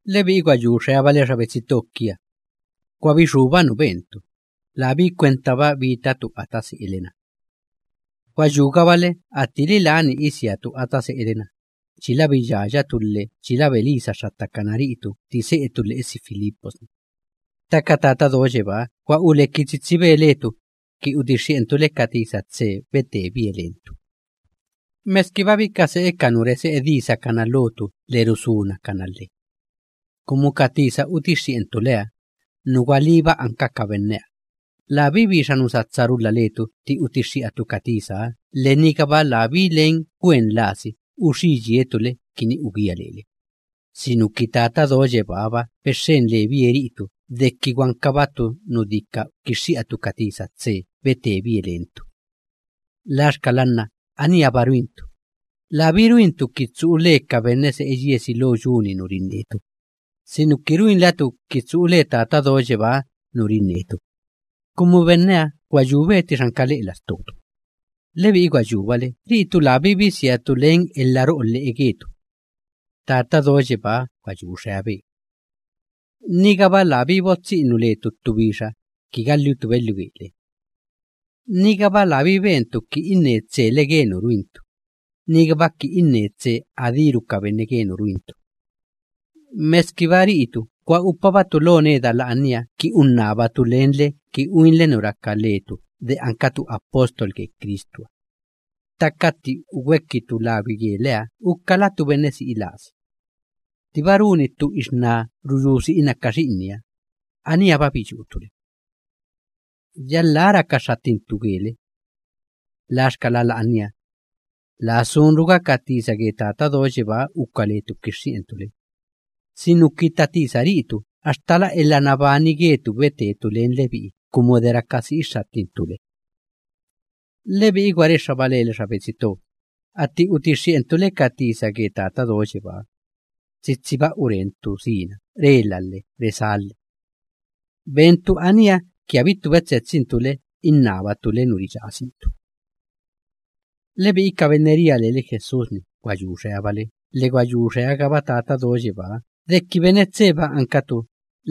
Lebi'i gwa yu xeabale xa betsi to kia, gwa bixúba nu bentu, labí kwentaba bitatu ata se'ele‑na. Gwa yúgabale attili lani isiatu ata se'ele‑na, chila biyayatu lhe chila belisa xxattakana ri'itu tti se'etu lhe'esi Filipos‑ni, ttaka Tata Do Yebáha gwa uleki tsitsibe letu ki utixxi'entu le ka tisa tse betebie lentu, meskiba bika se'e ka nu rese'e disakana lotu lhe rusunakana lhe. Kumu ka tisa utixxi'entu leha, nu gwalíba anka ka benneha, labí bixa nu satsa rulha letu tti utixxi'atu ka tisaha lhe nigaba labí len gwen lasi uxí yietu le kini ugía lele, sinuki Tata Do Yebáha‑ba bexxen lebie ri'itu deki gwankabatu nu dika kixxi'atu ka tisa tse betebie lentu. Laxkala nna aníha‑ba ruintu, labí ruintu ki tsu'u le ka benne se'e yiesi lo yu‑ni nu rinnetu, sinuki ruinlatu ki tsu'u le Tata Do Yebáha nu rinnetu, kumu benneha gwa yube ttixa anka lhe'e lastotu. Lebi'i gwa yúbale ri'itu labí bisiatu len elha ro'o lhe'e getu. Tata Do Yebáha gwa yu xeabe. Nigaba labí botsi'inu letu ttu bixa ki galhitu belhiu gele. Nigaba labí bentu ki inne tsele ge nu ruintu, nigaba ki inne tse adíru ka benne ge nu ruintu. Meskiba ri'itu gwa upabatu lo neda la'ania ki unnabatu lenle ki uinle nu raka letu de ankatu apóstol ge Cristuha, ttaka tti ugwekitu lagwi geleha ukalatu benne si'i lasi. Ttiba runi ttu ixná ruyú tsena ka xi'inniha, aníha‑ba biyútu le. Yalhá raka xxattintu gele. Laxkala la'ania, laa sunruga ka tisa ge Tata Do Yebáha uka letu kixxi'entu le, sinuki tatisa ri'itu axtala elha nabani getu betetu len lebi'i kumu de raka si'i xxattintu le. Lebi'i gwa rexxaba lele xa betsi to, atti utixxi'entu le ka tisa ge Tata Do Yebáha, tsitsiba urentu sina rela lhe resá lhe. Bentu aníha ki abittu betsetsintu le innabatu le nu riyasintu. Lebi'i ka benne chi ria lele Jesús‑ni gwa yu xeabale lhe gwa yu xeagaba Tata Do Yebáha deki ri'itu benne tseba ankatu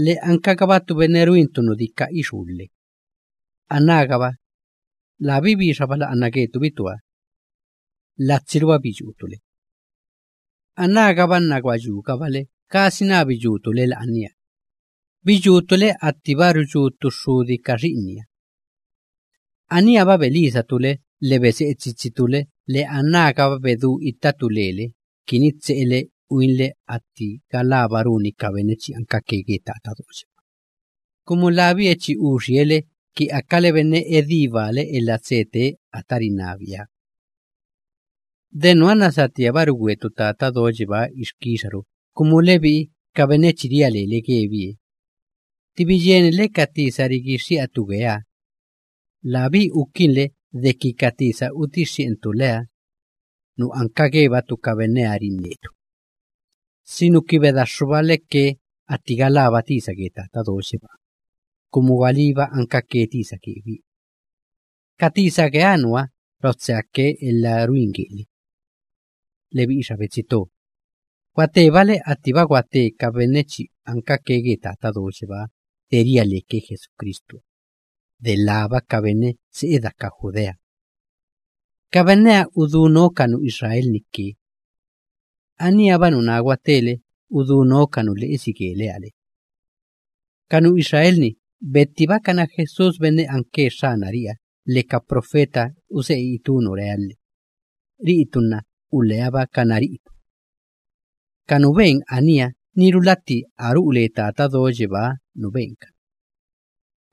lhe ankagabatu benne ruintu nu dika ixú lhe, anágaba, labí bixa bala'ana getu bitua. Latsiruba biyútu le. Anágaba nna gwa yúgabale gasina biyútu le la'ania; biyútu le attiba ruyú ttu xxudi ka xi'inniha. Aníha‑ba belisatu le lhe bese'e tsitsitu le lhe anágaba bedú ittatu lele kini tse'ele uinle atti galába runi ka benne chi ankake ge Tata Do Yebáha, kumu labie chi uxie le kini akale benne edí baale elha tse tee ata rinnabieha. De nuha nna satíaba rugwetu Tata Do Yebáha ixkixaru, kumu lebi'i ka benne chi ria lele gebie, tti biyieninle ka tisa rigixxi'atu geeha, labí ukinle deki ka tisa utixxi'entu leha, nu anka gebatu ka benneha rinnetu, sinuki bedaxxubale ke atti galába tisa ge Tata Do Yebáha, kumu de gwalíba ankake tisa gebie. Ka tisa geeha nuha rotseake elha ruin gele. Lebi'i xa betsi to, gwatebale attiba gwate ka benne chi ankake ge Tata Do Yebáha de ria leke Jesucristuha, delába ka benne se'e daka Judea. Ka benneha udú noo ka nu Israel‑ni ke. Aníha‑ba nuná gwatele udú noo ka nu lhe'esi geleha le. Ka nu Israel‑ni bettibakana Jesús benne anke Xxanari'iha lhe ka profeta use'e itú nu reha lhe; ri'itu nna uleabakana ri'itu. Ka nu ben aníha niru latti a ru'u le Tata Do Yebáha nu benkana.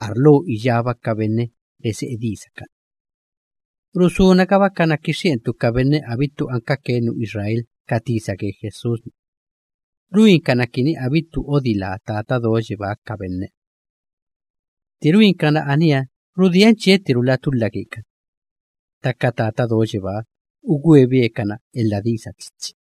Arlo iyába ka benne rese'e disakana. Rusunagabakana kixxi'entu ka benne abittu ankake nu Israel ka tisa ge Jesús‑ni, ruinkana kini abittu odilá Tata Do Yebáha ka benneha. Tti ruinkana aníha rudien chiettirula tulha gekani, ttaka Tata Do Yebáha ugwebe kana elha disa tsitsi.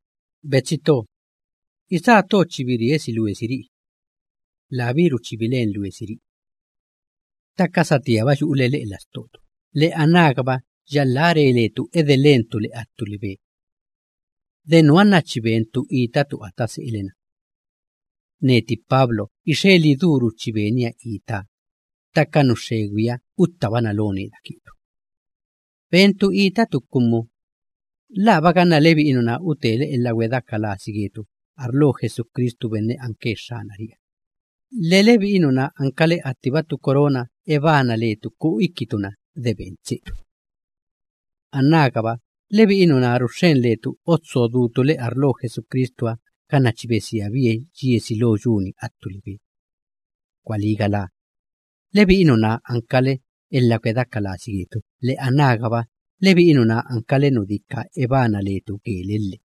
Betsi to, isá to chi biriesi luesiri'i, labíru chi bilen luesiri'i, ttaka satíaba yu'ule lhe'e lastotu lhe anágaba yalhá re letu edelentu le attu libe. De nuha nna chi bentu itatu ata se'ele‑na. Netiba Pablo ixe lidúru chi benia itaa, ttaka nu xxegwiha uttabana lo neda getu. Bentu itatu kumu, ¿laaba ganna lebi'i nuná utele elha gwedeaka lasi getu arlo Jesucristu benne anke Xxanari'iha, lhe lebi'i nuná ankale attiba ttu corona ebana letu ku'u ikitu‑na de ben tsetu? Anágaba lebi'i nuná ruxxen letu utso dutu le arlo Jesucristuha ganna chi besiabie yiesi lo yu‑ni attu libe. Gwalí galá, lebi'i nuná ankale elha gwedeaka lasi getu lhe anágaba lebi'i nuná ankale nu dika ebana letu gele lhe.